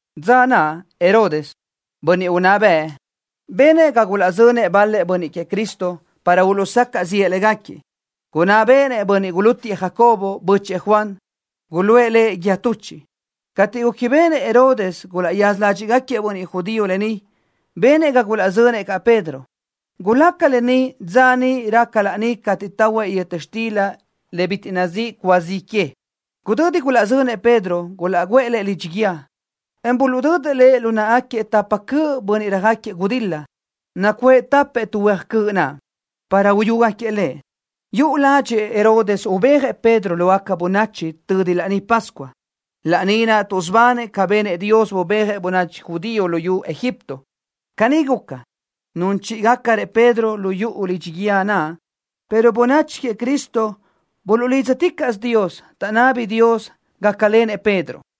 Dza naʼ Herodes, bönniʼ unná bëʼ, benëʼ ga gulaʼzönëʼ bal-lëʼ bönniʼ queëʼ Cristo para uluʼsacaʼ ziʼë légaquiëʼ. Gunná béʼenëʼ bönniʼ gulútiëʼ Jacobo, bö́chëʼë Juan. Guluʼë lëʼ guíë tuchiʼ. Cateʼ gúquibeʼenëʼ Herodes gulaʼyaza ládxiʼgaquiëʼ bönniʼ judío lë ni, benëʼ ga gulaʼzönëʼ caʼ Pedro. Gulaca lë ni dza niʼ raca laní cateʼ tahuëʼ yöta xtila bitiʼ nazíʼi cúa zi que. Gudödi gulaʼzönëʼ Pedro, gulaʼguʼë lëʼ lidxi guíë, en buluʼdödëʼ lëʼ lu náʼagaquiëʼ tapa cöʼ bönniʼ röjáquiëʼ gudil-la, nacuʼë tapëʼ tu huéaj cöʼ naʼ, para uyúgaquiëʼ lëʼ. Yuʼu ládxëʼë Herodes ubéajëʼ Pedro lógaca bönachi tödi Laní Pascua, laní naʼ tuʼsubanëʼ ca benëʼ Dios, bubéajëʼ bönachi judío luyú Egipto. Caní guca, nun chíʼigacrëʼ Pedro lu yuʼu lidxi guíë naʼ, pero bönachi queëʼ Cristo buluʼlídzaticaʼsö Dios, taʼnábini Dios gácalenëʼ Pedro.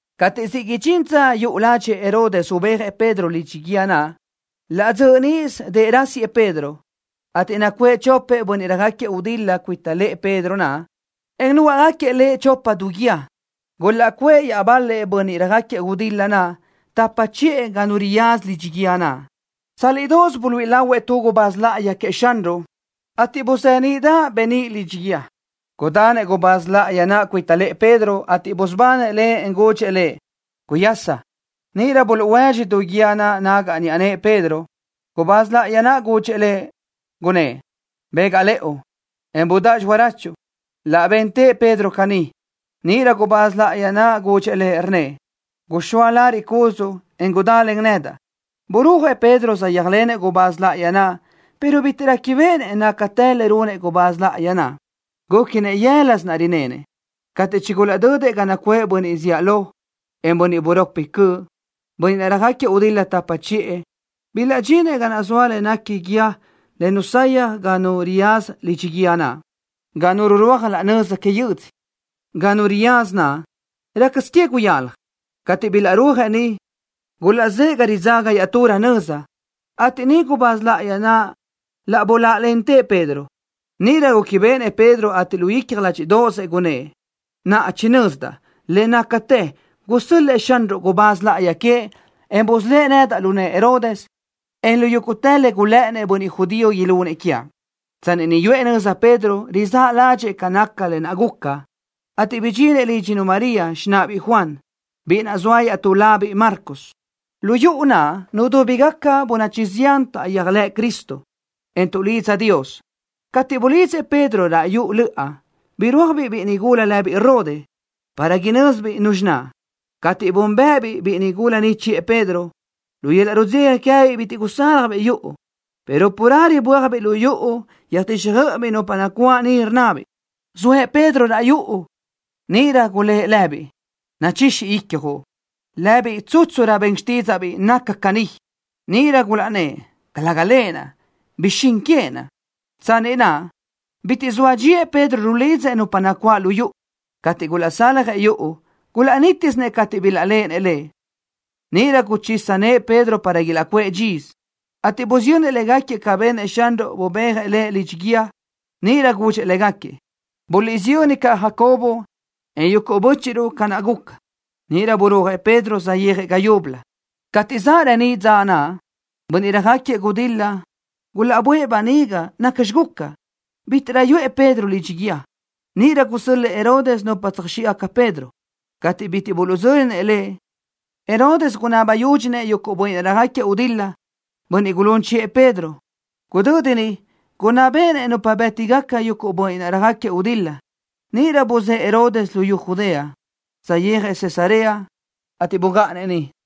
Cateʼ siʼ idxín dza yuʼu ládxëʼë Herodes ubéajëʼ Pedro lidxi guíë naʼ, laʼ dzöʼ níʼisö dëʼ rásiëʼ Pedro, ateʼ nacuʼë chopëʼ bönniʼ röjáquiëʼ gudil-la cuita lëʼë Pedro naʼ, en núgaʼgaquiëʼ lëʼ chopa du guíë. Gulaʼcuʼë iaʼbal-lëʼ bönniʼ röjáquiëʼ gudil-la tapa chiʼë ga nu riyaza lidxi guíë naʼ. Tsálidoʼos buluíʼi lahuëʼ tu gubáz láʼayi queëʼ Xanruʼ niʼ, ateʼ buzeníʼdaʼ beníʼ lidxi guíë. Gudanëʼ gubáz láʼayi naʼ cuita lëʼë Pedro, ateʼ busubanëʼ lëʼ, en gudxëʼ lëʼ: —Guyaschi. Níʼirö buluʼhuédxi du guíë naʼ nagaʼ niʼa nëʼë Pedro. Gubáz láʼayi naʼ gudxëʼ lëʼ, gunnë́ʼ: —Bégaʼ lëʼu, en gudáʼ xirachuʼ. Laʼ bentëʼ Pedro caní. Níʼirö gubáz láʼayi naʼ gudxëʼ lëʼ, rnnëʼ: —Guxóa lariʼ cúdzuʼu, en gudá len nedaʼ. Burúajëʼ Pedro, saʼyéajlenëʼ gubáz láʼayi naʼ, pero bitiʼ réquibeʼenëʼ nácatë le runëʼ gubáz láʼayi naʼ. Gúquinëʼ yë́lasö rinenëʼ. Cateʼ chigulaʼdödëʼ ga nacuʼë bönniʼ zíʼalö, en bönniʼ buropi cöʼ, bönniʼ naʼ röjáquiëʼ gudil-la tapa chiʼë, bilaʼdxinëʼ ga zoa le néquini guíë le nusayaj ga nu riyaza lidxi guíë naʼ, ga nu rurúaj laʼ nöza que yödzö. Ga nu riyaza naʼ, rácasö que guyalaj. Cateʼ bilaʼrúajëʼ niʼ, gulaʼzë́ʼë ga ridzaga iaʼturö nöza, ateʼ niʼ gubáz láʼayi naʼ laʼ buláʼalentëʼ Pedro. Níʼirö réquibeʼenëʼ Pedro, ateʼ lu icja ládxiʼdaʼazëʼ gunnë́ʼ: —Naʼa chinözdaʼ le nácatë gusö́l-lëʼë Xanruʼ gubáz láʼayi queëʼ, en busölë́ʼ nedaʼ lu nëʼë Herodes, en lu yúguʼtë le gulë́ʼënnëʼ bönniʼ judío ilunëʼ quiaʼ. Tsanni niʼ yuʼë nöza Pedro, rizáʼ ládxëʼë ca naca lë naʼ guca, ateʼ bidxinëʼ lídxinu María, xináʼabiʼ Juan, biʼi naʼ zoa iaʼtú labiʼ Marcos. Lu yuʼu naʼ nudúbigaca bönachi zián taʼyéajlëʼ Cristo, en tuʼlidza Dios. Cateʼ bulidzëʼ Pedro raʼ yuʼu löʼa, birúajbiʼ biʼi nigula lëbiʼ Rode para inö́zibiʼ nuzxi naʼ. Cateʼ búnbëʼëbiʼ biʼi nigula ni chiʼë Pedro, lu yöl-laʼ rudzeja queë́biʼ bitiʼ gusaljbiʼ yuʼu, pero carelö bö́ajbiʼ lu yuʼu, yöjtíxjöiʼibiʼ nupa nacuáʼ niʼ, rnnabiʼ: —Zoëʼ Pedro raʼ yuʼu. Níʼirö gulë́ʼ lëbiʼ: —Nachixi icjuʼ. Lëbiʼ tsútsurö ben xtídzaʼbiʼ naca caní. Níʼirö gulaʼnnë́ʼ: —Calëga lëʼ. Bixín queëʼ naʼ. Tsanni naʼ bitiʼ zoa dxíëʼ Pedro rulidzëʼ nupa nacuáʼ lu yuʼu. Cateʼ gulaʼsaljëʼ yuʼu, gulaʼnítisinëʼ cateʼ bilaʼléʼenëʼ lëʼ. Níʼirö guchisa nëʼë Pedro para ilaʼcuʼë dxisö, ateʼ busiyönnëʼ légaquiëʼ ca benëʼ Xanruʼ, bubéajëʼ lëʼ lidxi guíë. Níʼirö gudxëʼ légaquiëʼ: —Guliʼsiyö́nnëʼ caʼ Jacobo, en yuguʼ bö́chiʼruʼ ca naʼ guca. Níʼirö burúajëʼ Pedro, saʼyéajëʼ ga yúbölö. Cateʼ zaʼ reníʼ dza naʼ, bönniʼ röjáquiëʼ gudil-la gulaʼböʼë böniga nacxi guca, bítiʼrö yuʼë Pedro lidxi guíë. Níʼirö gusö́l-lëʼë Herodes nupa tsöjxíʼgaca Pedro. Cateʼ bitiʼ buluʼdzö́linëʼ lëʼ, Herodes gunabi yúdxinëʼ yuguʼ bönniʼ naʼ röjáquiëʼ gudil-la, bönniʼ gulún chiʼë Pedro. Gudödi niʼ gunná béʼenëʼ nupa bë́tigaca yuguʼ bönniʼ naʼ röjáquiëʼ gudil-la. Níʼirö buzë́ʼë Herodes luyú Judea, saʼyéajëʼ Cesarea, ateʼ bugáʼanëʼ niʼ.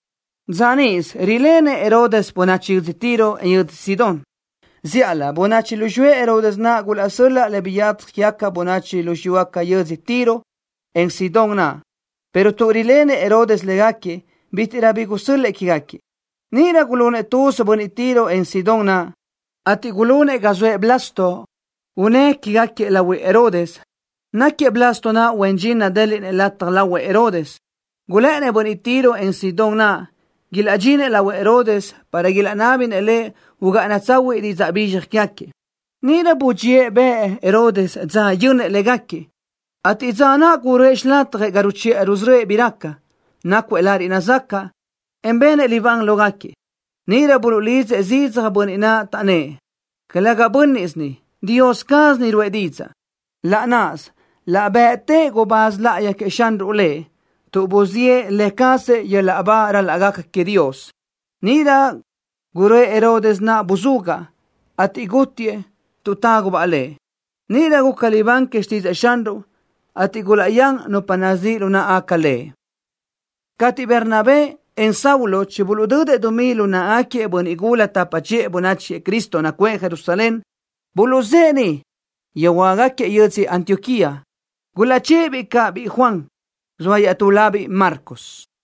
Dza níʼisö rilenëʼ Herodes bönachi yödzö Tiro, en yödzö Sidón. Zíʼalö bönachi lu xiyúëʼ Herodes naʼ gulaʼsö́l-laʼ le biyadzaj quégaca bönachi lu xiyúgaca yödzö Tiro, en Sidón naʼ, pero tuʼ rilenëʼ Herodes légaquiëʼ, bítiʼrö bi taʼsö́l-lëʼë quégaquiëʼ. Níʼirö gulunëʼ tuz bönniʼ Tiro, en Sidón naʼ, ateʼ gulunëʼ ga soëʼ Blasto unë́ quégaquiëʼ lahuëʼ Herodes naʼ. Náquiëʼ Blasto naʼ huen dxin nadéliʼnëʼ lataj lo lahuëʼ Herodes. Gulë́ʼënnëʼ bönniʼ Tiro, en Sidón naʼ ilaʼdxinëʼ lahuëʼ Herodes, para ilaʼnábinëʼ lëʼ ugáʼana tsahuiʼ didzaʼ bizxaj quégaquiëʼ. Níʼirö budxíëʼ bëʼ Herodes dza yönnëʼ légaquiëʼ, ateʼ dza naʼ guröʼë xilatjëʼ ga ruchiʼa rusörö́ëʼ bi raca, nácuëʼ lariʼ nazacaʼ, en benëʼ libán lógaquiëʼ. Níʼirö buluʼlidzëʼ zidzaj bönniʼ naʼ, taʼnnë́ʼ: —¡Calëga bö́nniʼsö ni! ¡Dios caz ni ruʼë didzaʼ! Laʼ náʼasö laʼ bëʼtëʼ gubáz láʼayi queëʼ Xanruʼ lëʼ tuʼ buziʼë lë cazëʼ yöl-laʼ ba ral-laʼ gaca queëʼ Dios. Níʼirö guröʼë Herodes naʼ buzugaʼ, ateʼ gútiëʼ tuʼ tágubaʼ lëʼ. Níʼirö guca libán que xtídzëʼë Xanruʼ, ateʼ gulaʼyán nupa nazíʼ lu náʼagaca le. Cateʼ Bernabé, en Saulo chibuluʼdödëʼ dumí naʼ lu náʼagaquiëʼ bönniʼ gula tapa chiʼë bönachi queëʼ Cristo nacuʼë Jerusalén, buluʼzë́ʼë niʼ, yöjhuö́jgaquiëʼ yödzö Antioquía. Gulaʼchë́ʼë-biʼ caʼ biʼi Juan, zoa iaʼtú labiʼ Marcos.